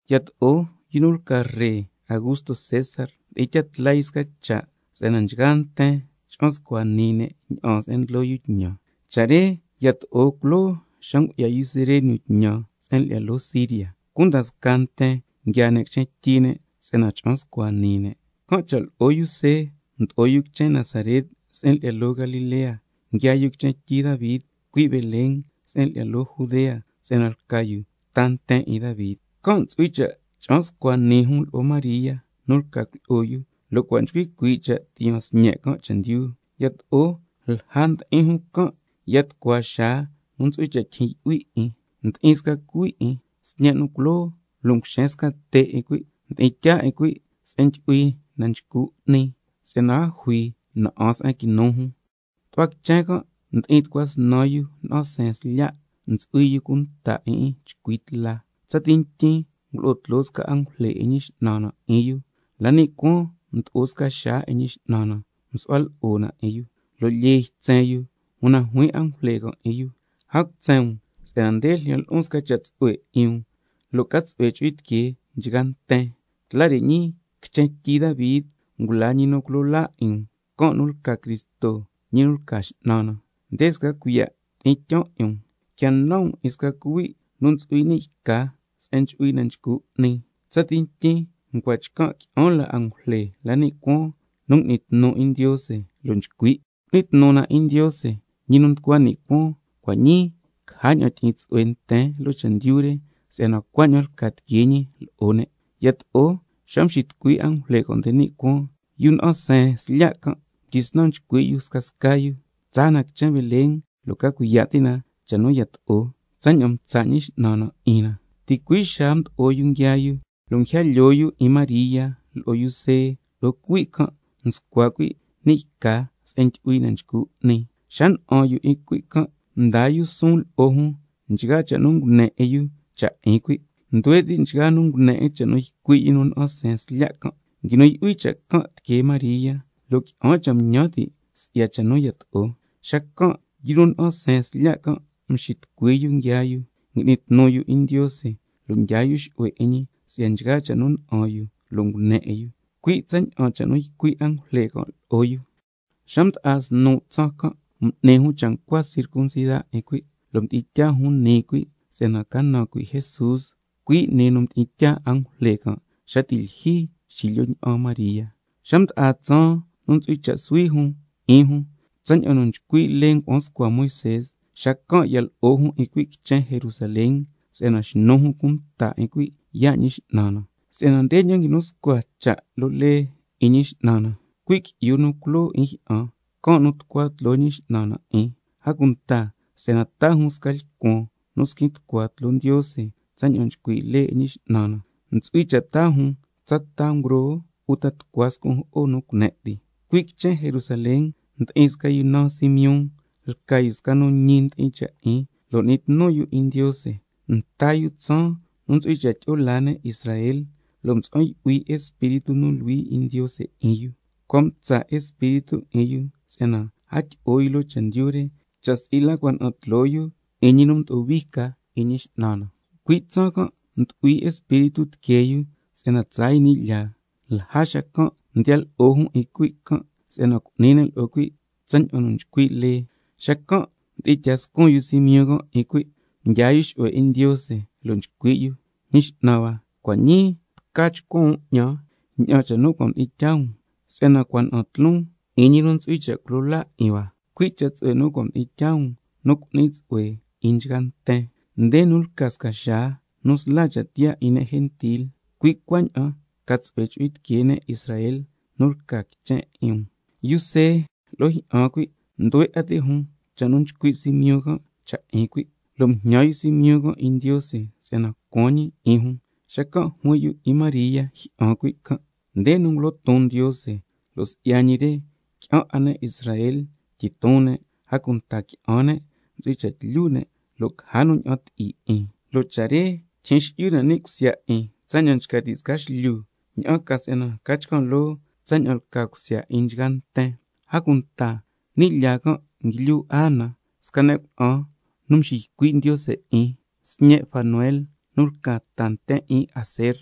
Yato'o yu nu lca ree Augusto César, mdi'in tyaa tla yu sca cha' si'yana nchgaa nten cha'an scua nii ne' ña'aan se'en ndlo yu tñan. Cha' re yato'o culoo xa ngu'ya yu Cirenio tñan se'en lyi'ya loo Siria. Cunda scaa nten nguiaa ne' quichen tyi ne' si'yana cha'an scua nii ne'. Can' cha' lo'o yu See mdo'o yu quichen Nazaret se'en lyi'ya loo Galilea, nguiaa yu quichen tyi Davi, cui' Belén se'en lyi'ya loo Judea, si'yana lca yu ta nten 'in Davi, can' ntsu'hui cha' cha'an scua nii jun lo'o María nu lca cuilyi'o yu, lo' cua' nchcui cuii' cha' tiyaan sñe' can' chendyu. Yato'o lja ndi'in jun can', ya tucua xaa nu ntsu'hui cha' tyijyin yu'hui 'in. Mdi'in sca cuhui' 'in, sñe' nu culoo, lo' nguxen sca te' 'in cuhui', mdi'in tyaa 'in cuhui' sca se'en ndyu'hui na nchcu 'ni, si'yana a jui na'an se'en quinu jun. Tu'hua quichen can' ndi'in tucua snan yu nu na'an seen slya', ntsu'hui yu cunta 'in 'in chcui tla. Tsati ntyin ngulo'o tloo sca angujle 'in Ñi X'nan na 'in yu, la ni' cuaan mdo'o sca xaa 'in Ñi X'nan na msu'hua lo'o 'in yu, lo' lyee ytsen yu. Una juin angujle can' lo'o yu: A cutsen um, si'yana nde ljyan lo'on sca cha' tsu'hue 'in um tsaña'an nu ca tsu'hue chu'hui tiquee nchgaa nten: Si'yana tla re ñii, quichen tyi Davi, ngula ñi nu culo laa 'in um, can' nu lca Cristo ñi nu lca X'nan na. Nde sca cuiya' nu ndyi'in tyaan 'in um: Quia nan um 'in sca cuhui' nu ntsu'hui ni' yca se'en ndyu'hui na nchcu 'ni. Tsati ntyin ncua chcan' qui'an la angujle la ni' cuaan nu ngui'ni tnu 'in Ndiose, lo' nchcui': ¡Cu'ni tnu na 'in Ndiose, ñi nu nducua ni' cuaan, cua' ñii caja ña'an tyi'in tsu'hue nten loo chendyu re, si'yana cuaña'an lca tiquee ñi lo'o ne'! Yato'o xa mxitucui angujle can' nde ni' cuaan, yu nu na'an seen slya' can' mdyisnan nchcui' yu scasca yu: Tsaa na quichen Belén lo' ca cuiya' ti' na cha' nu yato'o, tsaña'an mtsa' Ñi X'nan na 'in na. Ticui' xaa mdo'o yu nguiaa yu, lo' nguija lyoo yu 'in María lo'o yu See, lo' cuhui' can' nscua cuhui' ni' yca se'en ndyu'hui na nchcu 'ni. Xa na'an yu 'in cuhui' can', mdaa yu suun lo'o jun nchgaa cha' nu ngune 'in yu cha' 'in cuhui'. Nduhue ti' nchgaa nu ngune 'in cha' nu ycui' yu nu na'an seen slya' can'. Nguinu yu'hui cha' can' tiquee María, lo' qui'an cha' nguñan ti' si'ya cha' nu yato'o. Xacan' yu nu na'an seen slya' can' mxitucui yu nguiaa yu, ngui'ni tnu yu 'in Ndiose lo' ndyaa yu xu'hue 'in ñi si'ya nchgaa cha' nu na'an yu lo' ngune 'in yu, cui' tsaña'an cha' nu ycui' angujle can' lo'o yu. Xa mda'a snu' tsaan can' m'ni jun cha' ncua circuncida 'in cuhui', lo' mdi'in tyaa jun nii cuhui' si'yana ca naan cuhui' Jesús, cui' nii nu mdi'in tyaa angujle xa ti' lyijyi xilyo ña'an María. Xa mda'a tsaan nu ntsu'hui cha' suhui jun 'in jun, tsaña'an nu nchcui' lee ngua'an scua Moisé, xacan' ya lo'o jun 'in cuhui' quichen Jerusalén, si'yana xnu jun cunta 'in cuhui' yaa' Ñi X'nan na. (Si'yana ndeña'an nguinu scua cha' loo lee 'in Ñi X'nan na: —Cuhui' qui'yu nu culoo 'in jyi'an, can' nu tucua tloo Ñi X'nan na 'in—.) A cunta si'yana taa jun sca lcuan nu squin tucua tloo Ndiose tsaña'an nchcui' lee 'in Ñi X'nan na: Ntsu'hui cha' taa jun —tsa ta ngroo uta tucua scun' jo'o nu cune' ti—. Cui' quichen Jerusalén ndi'in sca yu nu naan Simeón, lca yu sca nu ñi ndi'in cha' 'in lo' n'ni tnu yu 'in Ndiose, lo'o yu nta yu tsaan nu ntsu'hui cha' tyi'o laa ne' Israel, lo' mtsa'an yu'hui yu lo'o Espíritu nu Luhui 'in Ndiose. Cua' mtsa' Espíritu 'in yu si'yana a tyi'o yu loo chendyu re, cha' si'i la cua' na'an tloo yu 'in ñi nu mdo'o hui ca 'in Ñi X'nan na. Cui' tsaan can' mdu'hui Espíritu tiquee yu si'yana tsaa yu ni' lyaa, lja xacan' mdiya lo'o jun 'in cuhui' can', si'yana cu'ni ne' lo'o cuhui' tsaña'an nu nchcui' lee. Xacan' mdi'in tyaa scun yu Simeón can' 'in cuhui', mdyaa yu xu'hue 'in Ndiose, lo' nchcui' yu: Ñi X'nan hua, cua' ñii tca chcuan um 'ñan ña'an cha' nu cua' mdi'in tyaa um, si'yana cua' na'an tloon 'in ñi nu ntsu'hui cha' culo laa 'in hua, cui' cha' tsu'hue nu cua' mdi'in tyaa um nu cu'ni tsu'hue 'in nchgaa nten, nde nu lca sca xaa nu sla cha' tiyaa 'in ne' gentil, cui' cuaña'an ca tsu'hue chu'hui tiquee ne' Israel nu lca quichen 'in um. Yu See lo'o jyi'an cuhui' nduhue 'a ti' jun cha' nu nchcui' Simeón can' cha' 'in cuhui'. Lo' mjñan yu Simeón 'in Ndiose si'yana ncuan ñi 'in jun, xacan' juin yu 'in María jyi'an cuhui' can': Nde nu ngulo ton Ndiose, lo' si'ya ñi re qui'an 'a ne' Israel tyiton ne', a cunta qui'an ne' ntsu'hui cha' tlyu ne', lo' caja nu ña'an ti'i 'in, (lo' cha' re tyijyin xi'yu na ni' cusya 'in tsaña'an nchca ti' sca xlyu), ña'an ca si'yana ca chcan' loo tsaña'an lca cusya 'in nchgaa nten. A cunta ni' lyaa can' nguilyu Ana, sca ne' cuna'an nu nxiycui' Ndiose 'in, sñe' Fanuel nu lca ta nten 'in Aser,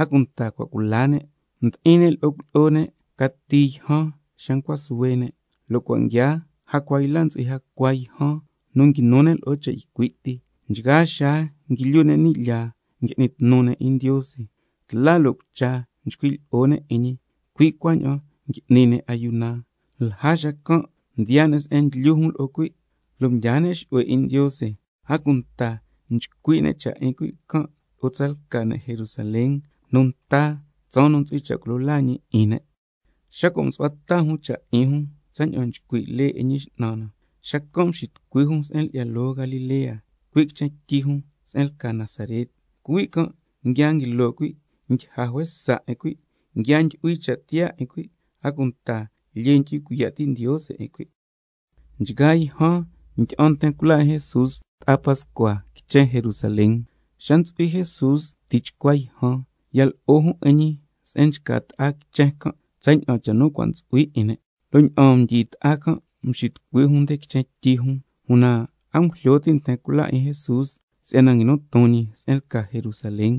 a cunta cua' cula ne', lo' mdi'in ne' lo'o cuilyi'o ne' cati yjan xa ncua suhue ne', lo' cua' nguiaa jacua yla ntsu'hui jacua yjan nu nguinu ne' lo'o cha' ycui' ti. Nchgaa xaa nguilyu ne' ni' lyaa ngui'ni tnu ne' 'in Ndiose, tla lo' cucha nchcui' lyi'o ne' 'in ñi, cui' cuaña'an ngui'ni ne' ayuna. Lja xacan' mdiyaa ne' se'en nguilyu jun lo'o cuhui' can', lo' mdyaa ne' xu'hue 'in Ndiose, a cunta nchcui' ne' cha' 'in cuhui' can' lo'o scasca ne' Jerusalén nu nta tsaan nu ntsu'hui cha' culo laa ñi 'in ne'. Xa cua' msu'hua ta jun cha' 'in jun tsaña'an nchcui' lee 'in Ñi X'nan na, xacan' mxitucui jun se'en lyi'ya loo Galilea, cui' quichen tyi jun se'en lca Nazaret. Cuhui' can' nguia nguilo cuhui', ndyija juesa 'in cuhui', nguia ndyu'hui cha' tiyaa 'in cuhui', a cunta lyee ndyu'hui cuiya' ti' Ndiose 'in cuhui'. Nchgaa yjan ndyi'an nten cula 'in Jesús ta'a Pascua quichen Jerusalén. Xa ntsu'hui Jesús tichcua yjan ya lo'o jun 'in ñi se'en nchca ta'a quichen can', tsaña'an cha' nu cua' ntsu'hui 'in ne'. Lo' ña'aan mdyi ta'a can' mxitucui jun nde quichen tyi jun, una a ngujlyo ti' nten cula 'in Jesús si'yana nguinu ton ñi se'en lca Jerusalén,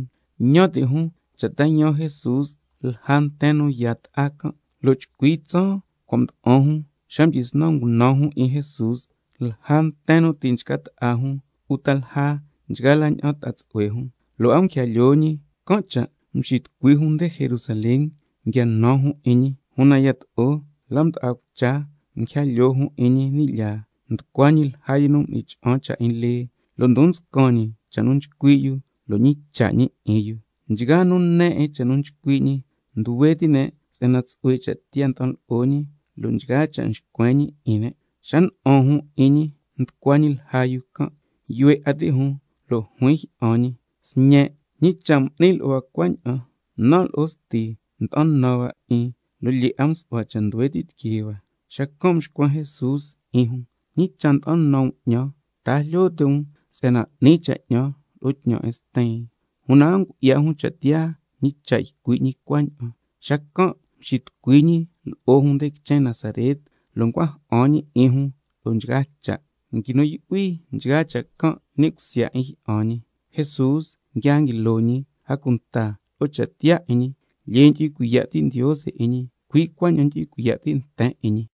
ñan ti' jun cha' ta yaan Jesús lja nten nu yaa ta'a can', lo' chcui tsaan cua' mda'an jun xa mdyisnan ngunan jun 'in Jesús lja nten nu ti' nchca ta'a jun, uta lja nchgaa la ña'an ta'a tsu'hue jun, lo' a nguija lyoo ñi, can' cha' xiya' mxitucui jun nde Jerusalén nu nguia nan jun 'in ñi. Una yato'o la mda'a cucha can' nguija lyoo jun 'in ñi ni' lyaa, nducua ñi lja yu nu m'ni cha'an cha' 'in lee, lo' ndon nscan ñi cha' nu nchcui' yu lo' ñicha' ñi 'in yu. Nchgaa nu ne 'in cha' nu nchcui' ñi, nduhue ti' ne' si'yana tsu'hue cha' tiyaa nda'an lo'o ñi, lo' nchgaa cha' nxcuen ñi 'in ne'. Xa na'an jun 'in ñi nducua ñi lja yu can', yuhue 'a ti' jun lo' juin jyi'an ñi: Sñen', ¿ñi cha' m'ni lo'o hua cuaña'an? Ña'an jan ñi, nan' lo'o sti nda'an nan hua 'in, lo' lyee 'a msu'hua cha' nduhue ti' tiquee hua Xacan' mxcuen Jesús 'in jun: ¿Ñi cha' nda'an nan um 'ñan, ta a jlyo ti' um si'yana 'ni cha' 'ñan lo'o tñan 'in Stin? Una a ngu'ya jun cha' tiyaa ñi cha' ycui' ñi cuaña'an. Xacan' mxitucui ñi lo'o jun nde quichen Nazaret, lo' ncua ja'an ñi 'in jun lo'o nchgaa cha'. Nguinu yu'hui nchgaa cha' can' ni' cusya 'in jyi'an ñi. Jesús nguia nguilo ñi, a cunta lo'o cha' tiyaa 'in ñi, lyee ndyu'hui cuiya' ti' Ndiose 'in ñi, ticui' cuaña'an ndyu'hui cuiya' ti' nten 'in ñi.